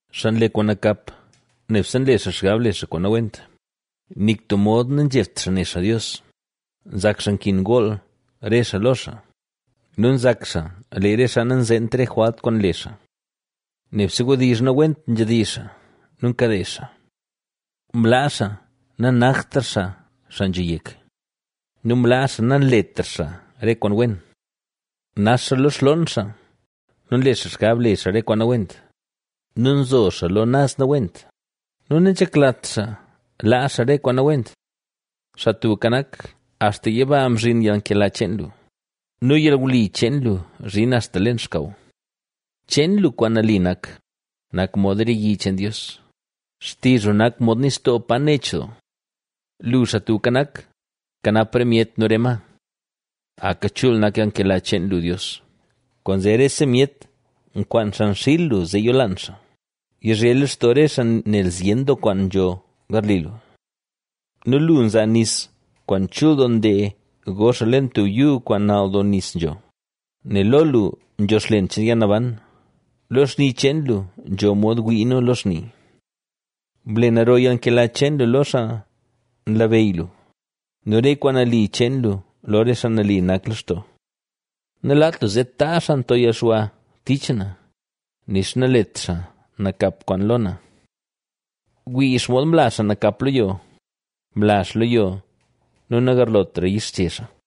Xaa nle kwaan nakap nebse nle xaa xgab le xaa kwaan nawent, nik tub mod nanzhebt xaa ne xaa Dios. Nzak xaa nkin gool re xaa lo xaa nu nzak xaa lee re xaa nanzeent re jwalt kwaan nle xaa. Nebse wdizh nawent nzhedizh xaa nu nkade xaa, mlaa xaa nanaktra xaa, xaa nzho yek nu mlaa xaa nanletra xaa re kwaan wen. Nax xaa lo xloon xaa nu nle xaa xgab le xaa re kwaan nawent nu nzo xaa lo naz nawent nu nanzheklat xaa laa xaa re kwaan nawent. Xaa Tubka Nak axta yiba nzhin yalnkela cheen lu nu yalwli cheen lu nzhin axta leen xkaw. Cheen lu kwaan nali nak, nak mod re yi cheen Dios, xtizh lu nak mod nistoo pa nech doo. Lu, Xaa Tubka Nak, nkanap re myet nu re ma. ¡Aka chul nak yalnkela cheen lu Dios! ¡Kwaanzee rese myet nkwaan xan xiil lu zee yolaan xaa! Yizhe lextoo re xaa nel zyen doo kwaan nzho garli lu nu lu nzaa nis kwaan chul doo ndee go xaa leen tub yuu kwaan nal doo nis nzho. Nel lo lu, nzho xlen cheen yalnaban, lo xni cheen lu, nzho mod wii nu lo xni. Ble naro yalnkela cheen lu lo xaa nlabeyy lu nu re kwaan nali cheen lu lo re xaa nali nak lextoo. Nalaat lu zee taazh xaa nto yalxwa tich na, nixa nalet xaa nakap kwaan lo na. ¡Wii xomod mla xaa nakap lo yo! ¡Mla xaa lo yo nu nagarlotra yixche xaa!